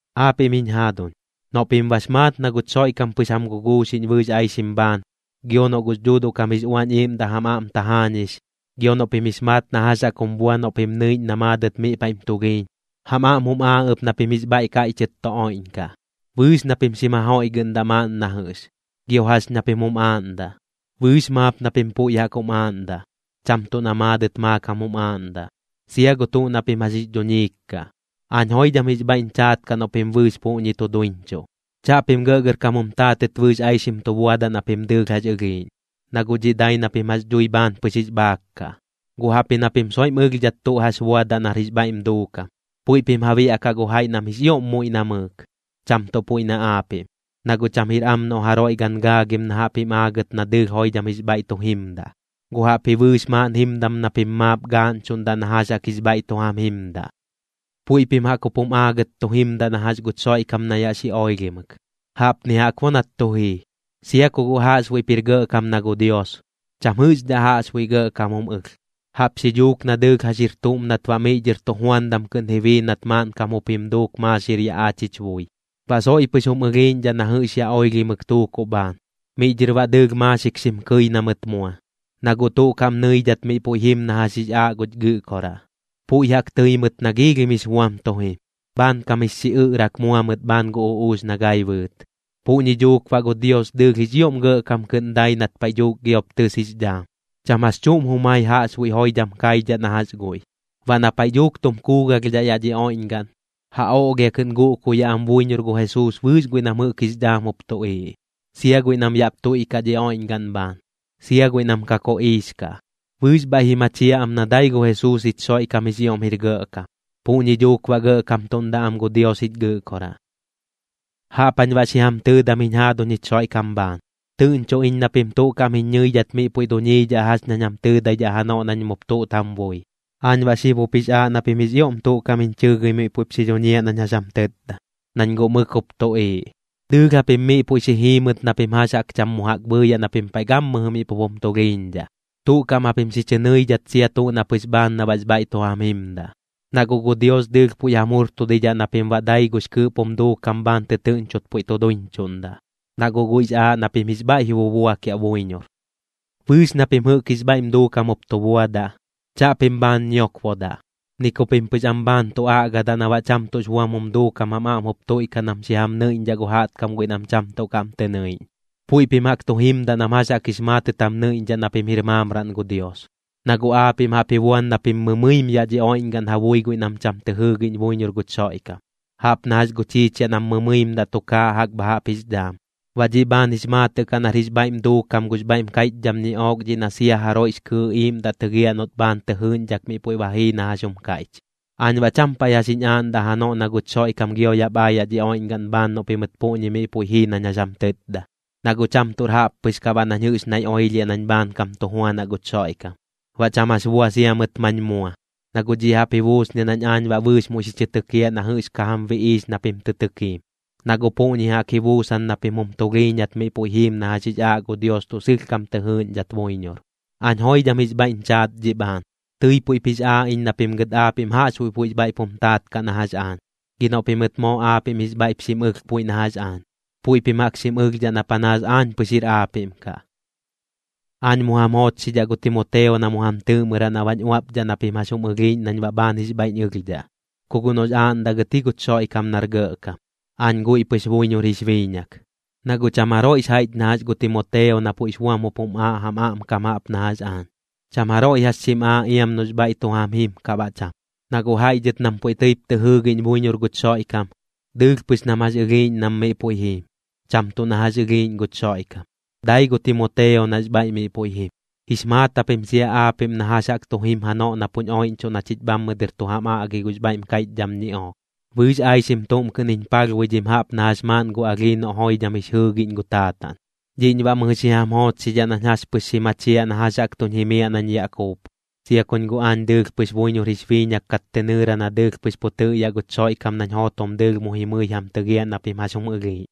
Aapiꞌm jiñ jaaduñ, noꞌ pim bax maat na guch Xoiꞌkam pɨx jam guguuxiꞌñ bɨɨx aixim bhaan, gio noꞌ gux Dhuuduꞌ kam jix Uañ Iiꞌmdaꞌ jam aꞌm tajaañix, gio noꞌ pim jix maat na jax jaꞌk jum bua noꞌ pim nɨiꞌñ na maadɨt miꞌ paiꞌm tulhiiñ, jam aꞌm jum aaꞌ ɨp na pim jix bhaiꞌ kaiꞌchɨt tu oiꞌñkaꞌ. Bɨɨx na pim xim ja joiꞌgɨꞌndaꞌ maaꞌn na jɨꞌx. Gio jax ña pim jum aaꞌndaꞌ, bɨɨx maap na pim puiꞌ jaꞌk jum aaꞌndaꞌ, cham tuꞌ na maadɨt maakam jum aaꞌndaꞌ, sia gu tuꞌ na pim jax jix dhuñiik kaꞌ. Aañ joidham jix bhaiꞌñ chaat kaꞌ noꞌ pim bɨɨx puꞌñi tu duiñchuꞌ. Chaꞌpim gɇꞌgɇrkam jum taatɨt bɨɨx aixim tu buadaꞌ na pim dɨɨlh jax ɨlhiiꞌñ, na guꞌ dhiꞌ dai na pim jax dhui bhaan pɨx jix bhaak kaꞌ, guꞌ jaꞌpji na pim soiꞌm ɨlhdhat tuꞌ jax buadaꞌ nar jix bhaiꞌm duukam. Puiꞌ pim ja biaꞌkaꞌ gu jaiꞌ nam jix ioꞌm muiꞌ namɨɨk, cham tuꞌ puiꞌ na aapiꞌm. Na guꞌ cham jir am noꞌ jaroiꞌ gan gaagim na jaꞌp jim aagɨt na dɨɨlh joidham jix bhaiꞌ tu jimdaꞌ, guꞌ jaꞌpji bɨɨx maaꞌn jimdam na pim maap gaaꞌñchuꞌndaꞌ na jax jaꞌk jix bhaiꞌ tu jam jimdaꞌ. Puiꞌ pim jaꞌk jup jum aagɨt tu jimdaꞌ na jax guch Xoiꞌkam na yaꞌ xi oilhimɨk. Jaꞌpni jaꞌk bo nat tu jii: Sia ku guꞌ jaꞌxbuiꞌp jir gɇꞌkam na gu Dios, cham jɨꞌxdhaꞌ jaꞌxbuiꞌ gɇꞌkam jum ɨlh. Jaꞌp xi dhuuk na dɨɨlh jax jir tuꞌm nat baꞌ miꞌ dhɨr tujuandam kɨꞌn ji bii nat maaꞌnkam jup jim duuk maaxir yaꞌ aach jich bui. Baꞌ soiꞌ pɨx jum ɨlhiiꞌñdhaꞌ na jɨꞌx yaꞌ oilhimɨk tuukuꞌ bhaan, miꞌ dhɨr baꞌ dɨɨlh maaxik xim kɨi na mɨt mua, na guꞌ tuꞌ kaꞌm nɨidhat miꞌ puiꞌ jim na jax jix aaꞌ guch Gɨꞌkoraꞌ. Puiꞌ jaꞌk tɨɨ mɨt na giilhim jix buam tu jim, bhaankam jix xiꞌɨꞌrak mua mɨt bhaan gu uꞌuux na gai bɨɨt. Puꞌñi dhuuk baꞌ gu Dios dɨɨlh jix ioꞌm gɇꞌkam kɨꞌn dai nat paiꞌ dhuuk giop tɨs jix dhaam, cham jax chuꞌm jumai jaꞌxbuiꞌ joidham kaidhaꞌ na jax guiꞌ. Baꞌ na paiꞌ dhuuk tum kuugalhdhaꞌ yaꞌ dhi oiꞌñgaꞌn, ja oꞌlhia kɨꞌn guꞌkuyaꞌ am buiñor gu Jesuus bɨɨx guiꞌ nam jɨꞌk jix dhaam jup tuꞌiiꞌ, sia guiꞌ nam yaꞌp tuiꞌkaꞌ dhi oiꞌñgaꞌn bhaan, sia guiꞌ nam ka koꞌiix kaꞌ. Bɨɨx bhaiꞌ ji machiaꞌ am na dai gu Jesuus jich Xoiꞌkam jix ioꞌm jir gɇꞌkam, puꞌñi dhuuk baꞌ gɇꞌkamtudaꞌ am gu Dios jich Gɨꞌkoraꞌ. Jaꞌp jañ baꞌ xi jam tɨɨdam jiñ jaaduñ jich Xoiꞌkam bhaan. Tɨꞌñcho iñ na pim tuꞌ kaꞌm jiñ ñɨidhat miꞌ puiꞌ duñiidhaꞌ jax ñañ jam tɨtdadaꞌ janoꞌ nañ mup tuꞌt jam bui. Aañ baꞌ xib jup jix aaꞌ na pim jix ioꞌm tuꞌ kaꞌm jiñ chɨɨgɨi miꞌ puiꞌp xi dhuñiaꞌ nañ jax jam tɨtda, nañ guꞌ mɨk jup tuꞌiiꞌ. Dɨɨlh japim miꞌ puiꞌ xi jiimɨt na pim jax jaꞌk cham mu jaꞌk bhɨɨyaꞌ na pim paiꞌ gammɨjɨ miꞌ pup jum tulhiiñdhaꞌ, tuꞌ kaꞌm japim xi chɨ nɨidhat sia tuꞌ na pɨx bhaan na baꞌx bhaiꞌ tu jam jimdaꞌ. Na guꞌ gu Dios dɨɨlh puiꞌ jam jurtudidhaꞌ na pim baꞌ dai gux kɨɨꞌp jum duukam bhaan tɨtɨɨꞌñchot puiꞌ tu duiñchuꞌndaꞌ, na guꞌ guiꞌx aaꞌ na pim jix bhaiꞌ ji bubuakiaꞌ buiñor. Bɨɨx na pim jɨꞌk jix bhaiꞌm duukam jup tu buadaꞌ, chaꞌpim bhaan ñiokbodaꞌ, ni ku pim pɨx am bhaan tu aꞌgadaꞌ na baꞌ cham tuꞌx buam jum duukam jam aꞌm jup tuiꞌkaꞌ nam xi jam nɨiꞌñdhaꞌ gu jaꞌtkam guiꞌ nam cham tuꞌ kaꞌm tɨ nɨiꞌñ. Puiꞌ pim jaꞌk tu jimdaꞌ nam jax jaꞌk jix maatɨt jam nɨiꞌñdhaꞌ na pim jir maamraꞌn gu Dios. Na guꞌ aapiꞌm jaꞌp ji buan na pim mɨmɨim yaꞌ dhi oiꞌñgaꞌn ja bui guiꞌ nam cham tɨ jɨɨgiꞌñ buiñor guch Xoiꞌkam, jaꞌp na jax gu chiichiaꞌ nam mɨmɨimdaꞌ tukaaꞌ jaꞌk bha jaꞌp jix dhaam. Baꞌ dhiꞌ bhaan jix maatɨꞌ kaꞌ nar jix bhaiꞌm duukam gux bhaiꞌm kaiꞌchdham ñiꞌook dhiꞌ na sia jaroiꞌx kɨɨꞌ iiꞌmdaꞌ tɨgiaꞌ noꞌt bhaan tɨ jɨɨꞌñdhak miꞌ puiꞌ ba jii na jax jum kaiꞌch. Aañ baꞌ cham paiꞌ jax jiñ aaꞌndaꞌ janoꞌ na guch Xoiꞌkam gio yaꞌp aayaꞌ dhi oiꞌñgaꞌn bhaan noꞌ pimɨt puꞌñi miꞌ puiꞌ jii nañ jax jam tɨtda, na guꞌ cham tuꞌr jaꞌp pɨx kaꞌ baꞌ nañ jɨꞌx naiꞌ oilhiaꞌ nañ bhaankam tu juanaꞌ guch Xoiꞌkam. Baꞌ cham jax bua sia mɨt mañ mua, na guꞌ dhiꞌ jaꞌp ji buusniaꞌ nañ aañ baꞌ bɨɨx muiꞌ xi chɨ tɨkiaꞌ na jɨꞌx ka jam biꞌiix na pim tɨ tɨkiim, na guꞌ puꞌñi jaꞌk ji buusan na pim jum tulhiiñat miꞌ puiꞌ jiim na jax jix aaꞌ gu Dios tuꞌ sɨlhkam tɨ jɨɨꞌñdhat buiñor. Aañ joidham jix bhaiꞌñ chaat dhiꞌ bhaan, tɨi puiꞌp jix aaꞌ iñ na pim gɨt aapiꞌm jaꞌxbuiꞌ puiꞌx bhaiꞌp jum taat kaꞌ na jax aañ. Gi noꞌ pimɨt moo aapiꞌm jix bhaiꞌp xim ɨlh puiꞌ na jax aañ, puiꞌ pim jaꞌk xim ɨlhdhaꞌ na panaas aañ pɨx jir aapiꞌm kaꞌ. Aañ mu jam joochxidhaꞌ gu Timoteo na mu jam tɨɨꞌmɨraꞌ na baꞌñ uaꞌpdhaꞌ na pim jax jum ɨlhiiꞌñ nañ baꞌ bhaan jix bhaiꞌñ ɨlhdhaꞌ, ku guꞌ noꞌx aaꞌndaꞌ gɨt ji guch Xoiꞌkam nar gɇꞌkam. Aañ guiꞌ pɨx buiñor jix biiñak. Na guꞌ cham jaroiꞌx jaiꞌch na jax gu Timoteo na puiꞌx buam jup jum aaꞌ jam aꞌmkam jaꞌp na jax aañ. Cham jaroiꞌ jax xim aaꞌ iam noꞌx bhaiꞌ tu jam jim kaꞌ baꞌ cham. Na guꞌ jaiꞌ dhɨt nam puiꞌ tɨip tɨ jɨɨgiꞌñ buiñor guch Xoiꞌkam, dɨɨlh pɨx nam jax ɨlhiiꞌñ nam miꞌ puiꞌ jiim, cham tuꞌ na jax ɨlhiiꞌñ guch Xoiꞌkam. Dai gu Timoteo nax bhaiꞌ miꞌ puiꞌ jim. Jix maat japim sia aapiꞌm na jax jaꞌk tu jim janoꞌ na puñ oiꞌñchuꞌ na chich bhammɨ dɨr tu jam aꞌgi gux bhaiꞌm kaiꞌchdham ñiꞌook, bɨɨx aixim tuꞌm kɨꞌn jiñ palhbuidhim jaꞌp na jax maaꞌn gu alhii noꞌ joidham jix jɨɨgiꞌñ gu taataꞌn. Dhiꞌñ baꞌ mɨjɨ xi jam joochxidhaꞌ nañ jax pɨx xi machiaꞌ na jax jaꞌk tuñ jimiaꞌ nañ yaꞌ kuup, sia kuñ guꞌ aañ dɨɨlh buiñor jix biiñak kat tɨ nɨɨra na dɨɨlh pɨx pu tɨꞌyaꞌ guch Xoiꞌkam nañ jootom dɨɨlh mu jimɨi jam tɨgiaꞌ na pim jax jum ɨlhiiꞌñ.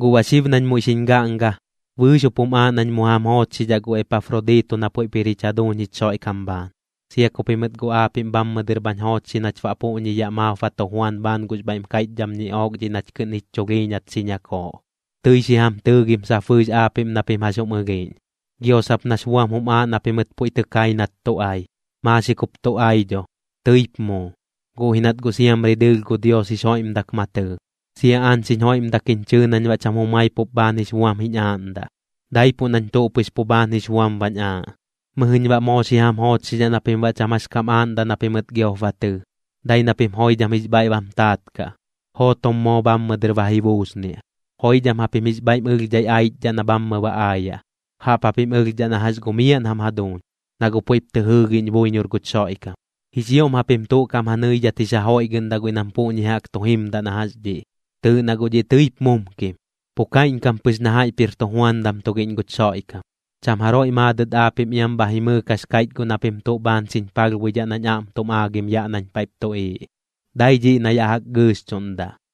Guꞌ baꞌ xib nañ muiꞌ xiñ gaꞌnga, bɨɨx jup jum aaꞌ nañ mu jam joochxidhaꞌ gu Epafrodito na puiꞌp jir jich jaduuñ jich Xoiꞌkam bhaan, sia ku pimɨt guꞌ aapiꞌm bhammɨ dɨr bhañ joochxi nach baꞌ puꞌñi yaꞌ maap ba tu juan bhaan gux bhaiꞌm kaiꞌchdham ñiꞌook dhiꞌ nach kɨꞌn jich chulhiiñat xi ñakooꞌ. Tɨi xi jam tɨɨgim sap bɨɨx aapiꞌm na pim jax jum ɨlhiiꞌñ, gio sap nax buam jum aaꞌ na pimɨt puiꞌ tɨ kai nat tu ai. Maaxik jup tu ai dho, tɨip muu, guꞌ ji nat guꞌ siamri dɨɨlh gu Dios jix joiꞌmdak ma tɨɨ, sia aañ xiñ joiꞌmdak jiñ chɨɨ nañ baꞌ cham jumai pup bhaan jix buam jiñ aaꞌndaꞌ, daipuꞌ nañ tuꞌ pɨx pu bhaan jix buam bañ aaꞌ. Mɨjɨñ baꞌ moo xi jam joochxidhaꞌ na pim baꞌ cham jax kam aaꞌndaꞌ na pimɨt giop ba tɨɨ, dai na pim joidham jix bhaiꞌ bam taat kaꞌ, jootom moo bhammɨ dɨr ba ji buusniaꞌ. Joidham japim jix bhaiꞌm ɨlhdhai aichdhaꞌ na bhammɨ ba aayaꞌ, jaꞌp japim ɨlhdhaꞌ na jax gu miaꞌn jam jaduuñ, na guꞌ puiꞌp tɨ jɨɨgiꞌñ buiñor guch Xoiꞌkam. Jix ioꞌm japim tuꞌ kaꞌm ja nɨidhat jix ja joiꞌgɨꞌndaꞌ guiꞌ nam puꞌñi jaꞌk tu jimdaꞌ na jax dhiꞌ. Tɨɨꞌ na guꞌ dhiꞌ tɨip mumkim, pu kaiꞌñkam pɨx na jaiꞌp jir tujuandam tugiꞌñ guch Xoiꞌkam. Cham jaroiꞌ maadɨt aapiꞌm iam bha jimɨɨk jax kaiꞌch guꞌ na pim tuꞌ bhaan xiñ palhbuidhaꞌ nañ aꞌm tum aagim yaꞌ nañ paiꞌp tuꞌiiꞌ, dai dhiꞌ na yaꞌ jaꞌk gɨɨxchuꞌndaꞌ.